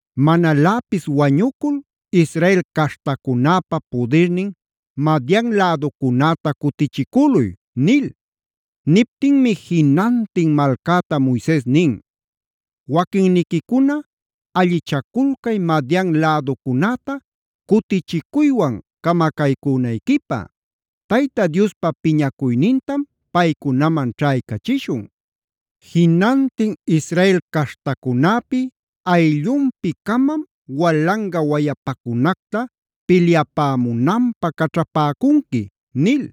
“Manaläpis wañucul Israel caśhtacunäpa pudirnin Madian läducunäta cutichicüluy” nil. Niptinmi jinantin malcäta Moises nin: “Waquinniquicuna allichaculcay Madian läducunäta cutichicuywan camacaycünayquipä. Tayta Diospa piñacuynintam paycunaman ćhaycachishun. Jinantin Israel caśhtacunäpi ayllunpi-camam walanga wayapacunacta pilyapämunanpä caćhapäcunqui” nil.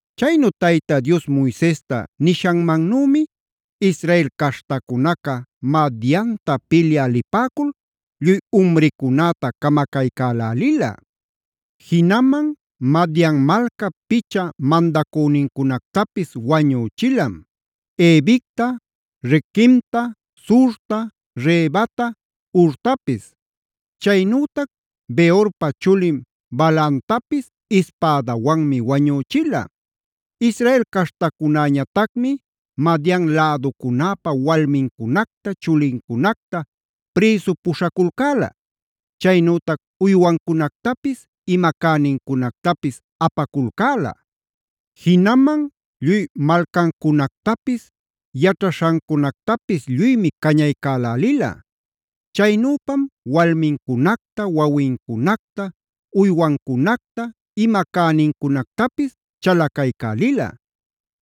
Chaynu Tayta Dios Moisesta nishanmannümi Israel caśhtacunaca Madianta pilyä lipäcul lluy umricunäta camacaycälälila. Jinaman Madian malcap picha mandacünincunactapis wañüchilam: Evicta, Requemta, Zurta, Rebata, Hurtapis. Chaynütac Beorpa chulin Balaamtapis ispädawanmi wañüchila. Israel caśhtacunäñatacmi Madian läducunäpa walmincunacta, chulincunacta prïsu puśhaculcäla. Chaynütac uywancunactapis, ima cänincunactapis apaculcäla. Jinaman lluy malcancunactapis yaćhaśhancunactapis lluymi cañaycalälila. Chaynüpam walmincunacta, wawincunacta, uywancunacta, ima cänincunactapis chalacaycälila.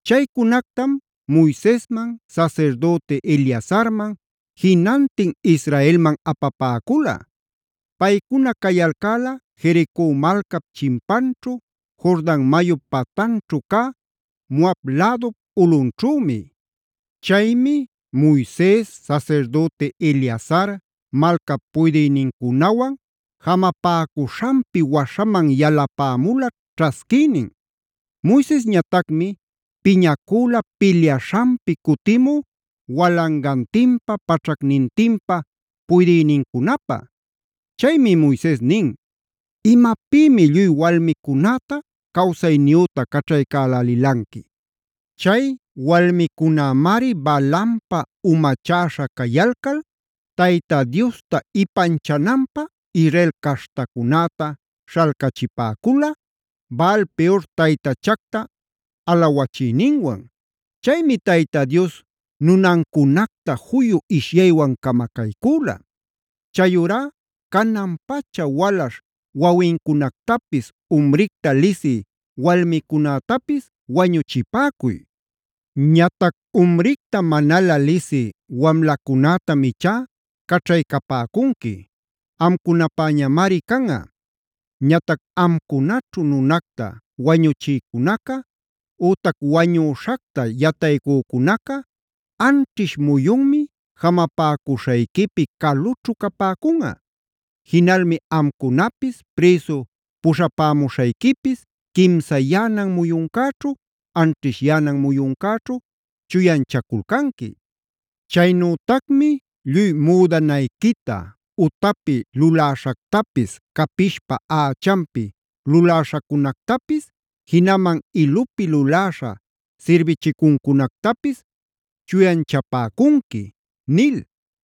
Chaycunactam Moisesman, sasirdüti Eleazarman, jinantin israelman apapäcula. Paycuna cayalcäla Jerico malcap chimpanćhu, Jordan mayup patanćhu cä Moab lädup ulꞌunćhümi. Chaymi Moises, sasirdüti Eleazar, malcap puydïnincunawan jamapäcuśhanpi waśhaman yalapämula ćhasquïnin. Moisesñatacmi piñacüla pilyaśhanpi cutimu walangantinpa, paćhacnintinpa puydïnincunapä. Chaymi Moises nin: “¿Imapïmi lluy walmicunäta cawsayniyüta caćhaycälälilanqui? Chay walmicunämari Balaampa umachäśha cayalcal Tayta Diosta ipanchananpä Israel caśhtacunäta śhalcachipäcula, Baal-peora taytachacta alawachiyninwan. Chaymi Tayta Dios nunancunacta juyu ishyaywan camacaycüla. Chayurá canan-pacha walaśh wawincunactapis, umricta lisï walmicunätapis wañuchipäcuy. Ñatac umricta manalä lisï wamlacunätam ichá caćhaycapäcunqui; amcunapäñamari canꞌa. “Ñatac amcunaćhu nunacta wañuchïcunaca ütac wañüśhacta yataycücunaca anćhish muyunmi jamapäcuśhayquipi calućhu capäcunꞌa. Jinalmi amcunapis, prïsu puśhapämuśhayquipis quimsayänan muyuncäćhu, anćhishyänan muyuncäćhu chuyanchaculcanqui. Chaynütacmi lluy müdanayquita, utapi luläśhactapis, capishpa ächanpi luläśhacunactapis, jinaman ilupi luläśha sirbichicuncunactapis chuyanchapäcunqui” nil.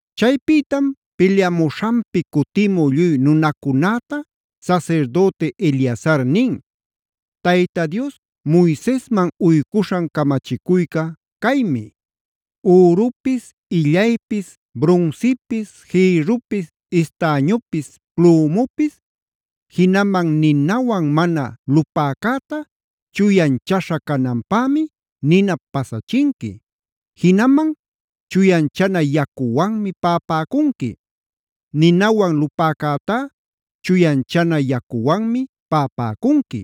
Chaypïtam pilyamuśhanpi cutimu lluy nunacunäta sasirdüti Eleazar nin: “Tayta Dios Moisesman uycuśhan camachicuyca caymi: Ürupis, illaypis, brunsipis, jïrrupis, estañupis, plomupis, jinaman ninawan mana lupäcäta chuyanchaśha cananpämi ninap pasachinqui. Jinaman chuyanchana yacuwanmi paꞌapäcunqui. Ninawan lupäcätá chuyanchana yacuwanmi paꞌapäcunqui.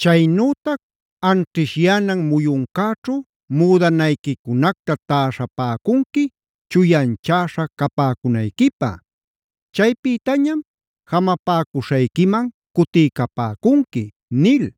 Chaynütac anćhishyänan muyuncäćhu müdanayquicunacta täśhapäcunqui chuyanchäśha capäcunayquipä. Chaypïtañam jamapäcuśhayquiman cutiycapäcunqui” nil.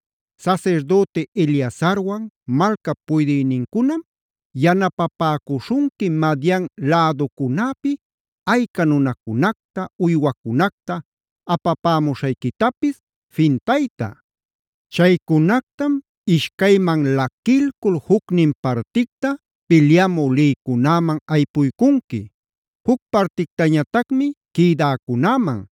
“Sasirdüti Eleazarwan malcap puydïnincunam yanapapäcuśhunqui Madian läducunäpi ayca nunacunacta, uywacunacta apapämuśhayquitapis fintayta. Chaycunactam ishcayman laquilcul jucnin particta pilyamü lïcunäman aypuycunqui; juc partictañatacmi quïdäcunäman.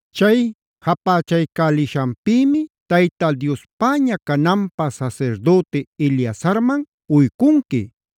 Chay japächaycälishanpïmi Tayta Diospäña cananpä sasirdüti Eleazarman uycunqui.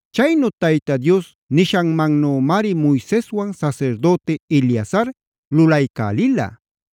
Chaynu Tayta Dios nishanmanümari Moiseswan sasirdüti Eleazar lulaycälila.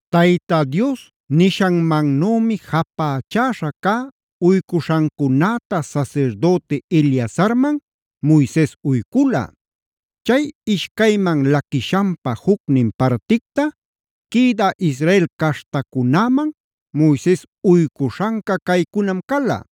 Tayta Dios nishanmannümi japächaśha cä uycuśhancunäta sasirdüti Eleazarman Moises uycula. Chay ishcayman laquishanpa jucnin particta quïdä Israel caśhtacunäman Moises uycuśhanca caycunam cala: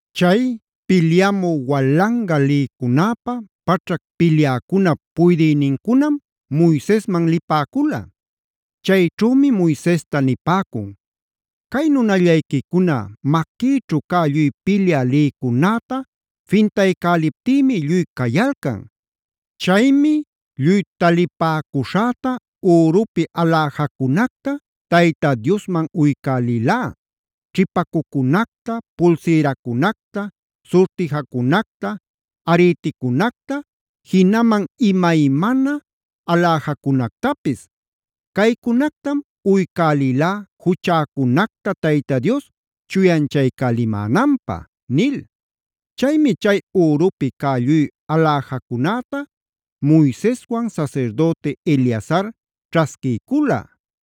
Chay pilyamü walanga lïcunäpa, paćhac pilyäcunap puydïnincunam Moisesman lipäcula. Chayćhümi Moisesta nipäcun: “Cay nunallayquicuna maquïćhu cä lluy pilyä lïcunäta fintaycäliptïmi lluy cayalcan. Chaymi lluy talipäcuśhäta ürupi aläjacunacta Tayta Diosman uycälilá: ćhipacucunacta, pulsiracunacta, surtijacunacta, ariticunacta, jinaman imaymana aläjacunactapis. Caycunactam uycälilá juchäcunacta Tayta Dios chuyanchaycälimänanpä” nil. Chaymi chay ürupi cä lluy aläjacunäta Moiseswan sasirdüti Eleazar ćhasquiycula.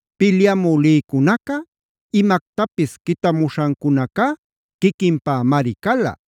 Pilyamü lïcunaca imactapis quitamuśhancunaca quiquinpämari cala.